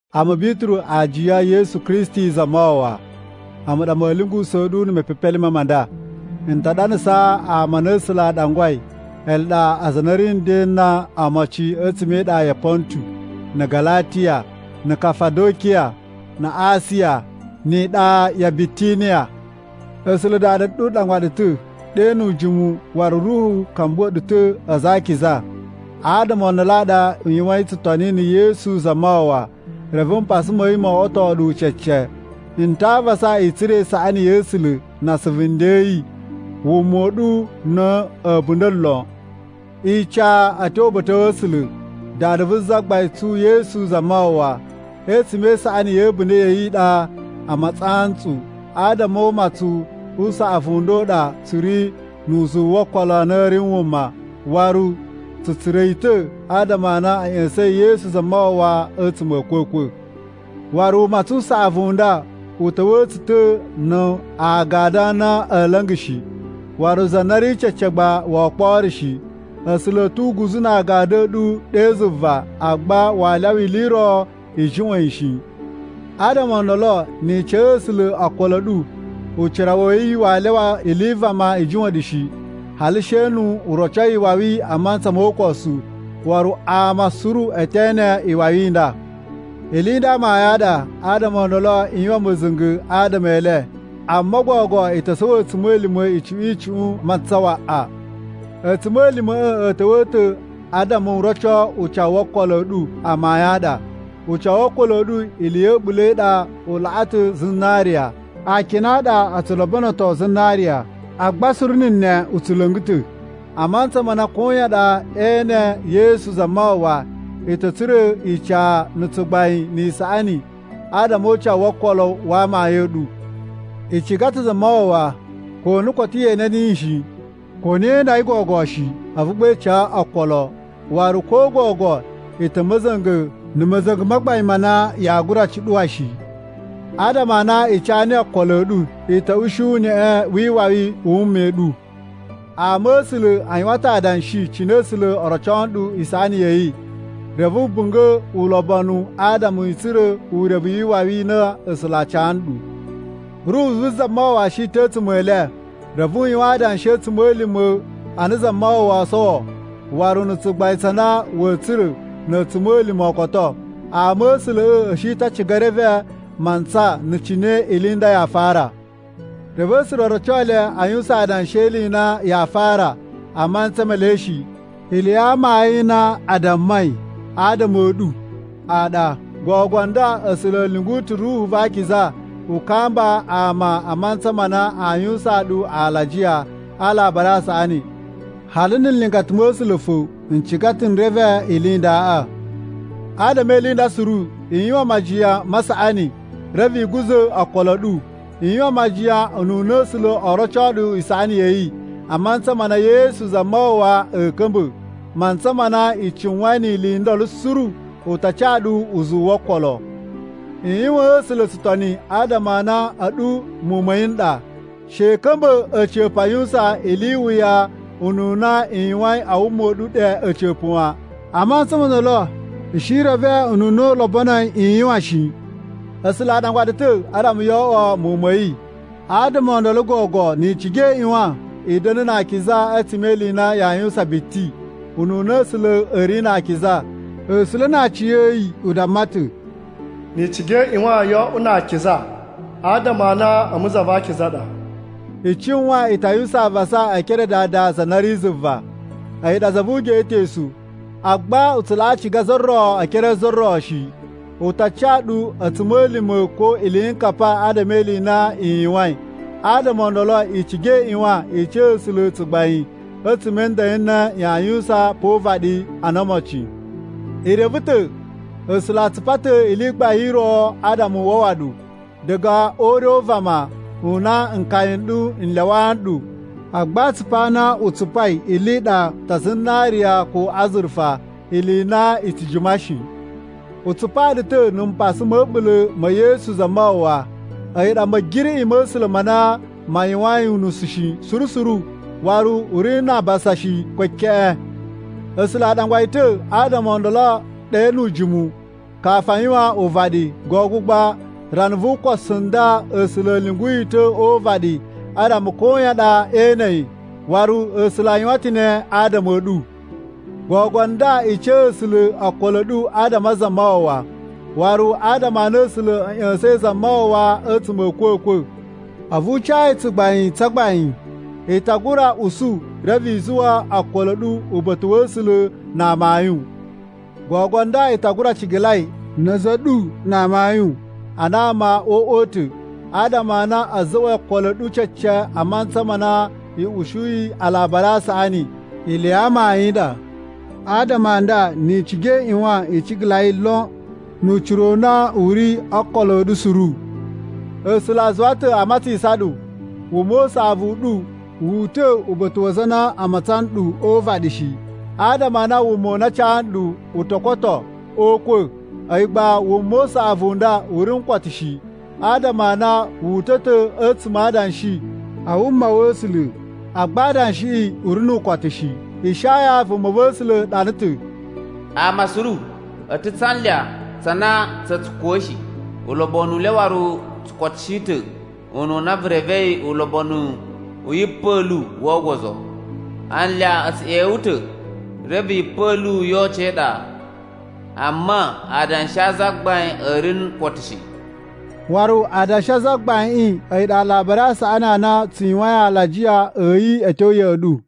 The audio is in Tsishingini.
A̱mu Bituru, aajiya e Yesu Kristi Zamawawa, a̱mu ɗa ma̱a̱ lyungusa̱a̱ ɗu mepepelime ma nda. N ta ɗanasaa ama a na A̱sula̱ a ɗangwai. Ele ɗa aza a na a̱ ri a̱ nden ana omocin a̱tsuma̱ e iɗa ya Pontu, na̱ Galatiya, na̱ Kafadokiya, na Asiya ni iɗa ya Bitiniya. A̱sula̱ Dada u ɗangwa ɗu ta̱ ɗe nu ujimu waru Ruhu ka̱mbuwa̱ ɗu ta̱ aza a akiza. Adama o ndolo a ɗa i yuwain tsutoni na̱ Yesu Zamawawa, reve mpasa ma̱ yi mo oꞌwoto ɗu cece. N ta avasa i tsura̱ isaꞌani ya̱ A̱sula̱ na asuvu nden a̱ yi a wuma u ɗu na̱ a̱bunda̱ lon. Ica a̱ tyo uba̱ta̱ wa̱ A̱sula̱, Dada vu Zagbain tsu Yesu Zamawawa. A̱tsuma̱ e isaꞌani ya̱ a̱bunda̱ ya̱ yi i ɗa a matsisan ntsu. Adama o umatsun u saꞌavu u nda u ɗa tsu ri nu uzuwu wo okolo a na a̱ ri wuma, waru tsu tsura̱ yi ta̱ adama a na a̱ ꞌya̱sa̱in Yesu Zamawawa a̱tsuma̱ a̱ a̱kwa̱kwa̱. Waru umatsun u saꞌavu u nda u ta̱wa̱a̱ tsu ta̱ na agadu a na a̱a̱ la̱nga̱ shi, waru za na ri cece agba woo kporo shi. A̱sula̱ a̱ tu uguzu na agadu a̱ ɗu ɗe zuva, agba waa lyawa ili i ro i juꞌwa̱n yi shi. Adama o ndolo ni i ca A̱sula̱ okolo a̱ ɗu, ucira wa̱ yi waa lyawa ili i vama i juꞌwa̱n ɗu shi, hali she nu u roco iwawi a mantsa mo ukosu. Waru ama suru e te ene iwawi i nda. Ili i nda amayun a ɗa, adama o ndolo i yuwan ma̱za̱nga̱ adama e le. Amma gogo i to sowo a̱tsuma̱lima̱ icuꞌun icuꞌun mantsa waꞌa. A̱tsuma̱lima̱ꞌa̱ a̱ ta̱wa̱ ta̱ adama u roco ucawu wo okolo a̱ ɗu amayun a ɗa. Ucawu wo okolo a̱ ɗu ili ya̱ a̱ɓula̱ i ɗa u laꞌa ta̱ zinariya. Akina a ɗa o tsu lobonoto zinariya agba suru na̱ ne u tsu la̱nga̱ ta̱. A mantsa ma na koyan ɗa ee ene Yesu Zamawawa, i ta̱ tsura̱ ica, na̱ tsugbain, ni isaꞌani adama o ucawu wo okolo wa amayun a̱ ɗu. I ciga ta̱ Zamawawa ko ana koto ye ene niyi shi. Ko na yee inda yi gogo shi, a̱vu gba i ca yi okolo. Waru ko gogo i ta̱ ma̱za̱nga̱ na̱ ma̱za̱nga̱ ma gbain ma na yaa gura cuɗuwa shi. Adama a na i ca niyi okolo a̱ ɗu, i ta̱ ushi uneꞌe wi iwawi i wuma i ɗu. Ama̱sula̱ a yuwan ta̱ adanshi cine A̱sula̱ oo roco ɗu isaꞌani ya̱ yi, reve a̱ bunga̱ ulobonu adama a̱ tsura̱ urevu wi iwawi i na A̱sula̱ aa ca ɗu. Ruhu vu Zamawawa shi ta̱ a̱tsuma̱ e le, reve u yuwan adanshi a̱ a̱tsuma̱lima̱ a na Zamawawa oo sowo waru na̱ tsugbain tsa na wa̱a̱ tsura̱ na̱ a̱tsuma̱lima̱ o koto. Ama̱sula̱ꞌa̱ a̱ shi ta̱ a ciga e reve mantsa na̱ cine ili i nda yaa fara. Reve A̱sula̱ o roco le aa yuwusan adanshi e ili i na yaa fara a mantsa me le shi, ili ya amayun i na a dammai adama a̱ ɗu a ɗa. Gogo nda A̱sula̱ a̱ lyungu ta̱ Ruhu va Akiza u kamba ama a mantsa ma na aa yuwusaan ɗu alajiya a Alabari a Saꞌani. Hali na̱ nlingata ma̱ A̱sula̱ fo n ciga ta̱ n reve ili i ndaꞌa. Adama e ili i nda suru, i yuwan majiyan ma saꞌani, reve i guza̱ okolo a̱ ɗu. I yuwan majiyan ununa A̱sula̱ oo roco ɗu isaꞌani ya̱ yi a mantsa ma na Yesu Zamawawa a̱a̱ ka̱mba̱. Mantsa ma na i cuwain ni ili i ndolo suru, u ta ca ɗu uzuwu wo okolo. I yuwaan A̱sula̱ tsutoni adama a na a̱ɗu muwun ma̱ yi n ɗa. She i ka̱mba̱ a̱ca̱pa̱ a yuwusan ili i wuya ununa i yuwain a wuma u ɗu ɗe a̱ca̱pa̱ wan. A mantsa mo ndolo i shi i reve ununa u lobonoi i yuwan shi. A̱sula̱ a ɗangwa ɗu ta̱ adama yoo oꞌwo muwun ma̱ yi, adama o ndolo gogo ni i ciga i ꞌyuwan i da̱na̱ na akiza a̱tsuma̱ e ili i na yaa yuwusan biti, ununa A̱sula̱ a̱ ri na akiza. A̱sula̱ na aciya̱yi u damma ta̱, “Ni i ciga i ꞌyuwan yoo oꞌwo na akiza adama a na a̱mu za va akiza a ɗa.” I cuwan i ta yuwusan avasa e ekere a Dada za na ri zuva. A̱yi ɗa za vu ugeꞌetosu, agba u tsu laꞌa ciga za ro e ekere a za ro shi. U ta ca ɗu a̱tsuma̱lima̱ ko iliyinkapa adama e ili i na i yuwain. Adama o ndolo i ciga i ꞌyuwan i ca A̱sula̱ tsugbain a̱tsuma̱ a̱ nden n na yaa yuwusan pa o uvaɗi ana omocin. I reve ta̱ A̱sula̱ a tsupa ta̱ ili i gbain i ro adama u wawa ɗu diga o ure u vama u na nkaya n ɗu n lyawaa nɗu. Agba atsupu a na u tsupai ili i ɗa tsa zinariya ko azurufa, ili i na i tsu jima shi. U tsupaa ɗu ta̱ na̱ mpasa ma̱ a̱ɓula̱ ma̱ Yesu Zamawawa. A̱yi ɗa Ma̱giriꞌi ma̱ A̱sula̱ ma na ma yuwain unusu shi suru suru, waru u ri na abasa shi, ko keꞌen. A̱sula̱ a ɗangwa yi ta̱ adama o ndolo ɗe nu ujimu kafu a yuwan uvaɗi, gogo gba a rana vu ukosu u nda A̱sula̱ a̱ lyungu yi ta̱ o uvaɗi adama koyan ɗa ee ene yi. Waru A̱sula̱ a yuwan ta̱ ne adama a̱ ɗu. Gogo nda, i ca A̱sula̱ okolo a̱ ɗu adama a Zamawawa. Waru adama a na A̱sula̱ a̱ ꞌya̱sa̱in Zamawawa a̱tsuma̱ a̱ a̱kwa̱kwa̱, a̱vu u ca yi tsugbain tsa gbain. I ta gura usu reve i zuwa okolo a̱ ɗu uba̱ta̱ wa̱ A̱sula̱ na amayun. Gogo nda, i ta gura cigalai na̱ a̱za̱ a̱ ɗu na amayun ana ama o uꞌwa u ta̱. Adama a na a̱ za̱ꞌwa̱i okolo a̱ ɗu cece a mantsa ma na i usuyi Alabari a Saꞌani ili ya amayun i ɗa. Adama a nda ni i ciga i ꞌyuwan i cigalai lon, nu ucira u na u ri o okolo a̱ ɗu suru. A̱sula̱ a zuwa ta̱ a matsisan ɗu. Wuma u saꞌavu u ɗu wu uta̱ uba̱ta̱ wa aza a na a matsan nɗu o uvaɗi shi. Adama a na wuma u na a ca nɗu u to koto o ukwa̱. A̱yi gba wuma u saꞌavu u nda u ri nu ukotu shi, adama a na wu uta̱ ta̱ a̱tsuma̱ a adanshi a wuma wa̱ A̱sula̱, agba adanshiꞌi u ri nu ukotu shi. Ishaya vumava̱sula̱ ɗana ta̱: “Ama suru a̱ ta̱ tsa anlya tsa na tsa̱ tsu kuwushi, ulobonu u le waru u tsu kotushi ta̱ ununa vu revei ulobonu u yipa̱lu wo ogozo. Anlya a̱ tsu ꞌyewe ta̱ reve yipa̱lu yo oco e iɗa. Amma adanshi a Zagbain a̱ ri nu ukotu shi.” Waru adanshi a Zagbaiꞌin a̱yi ɗa Alabari a Saꞌani a na tsu yuwain alajiya a̱ yi a̱ tyo ya̱ꞌa̱ ɗu.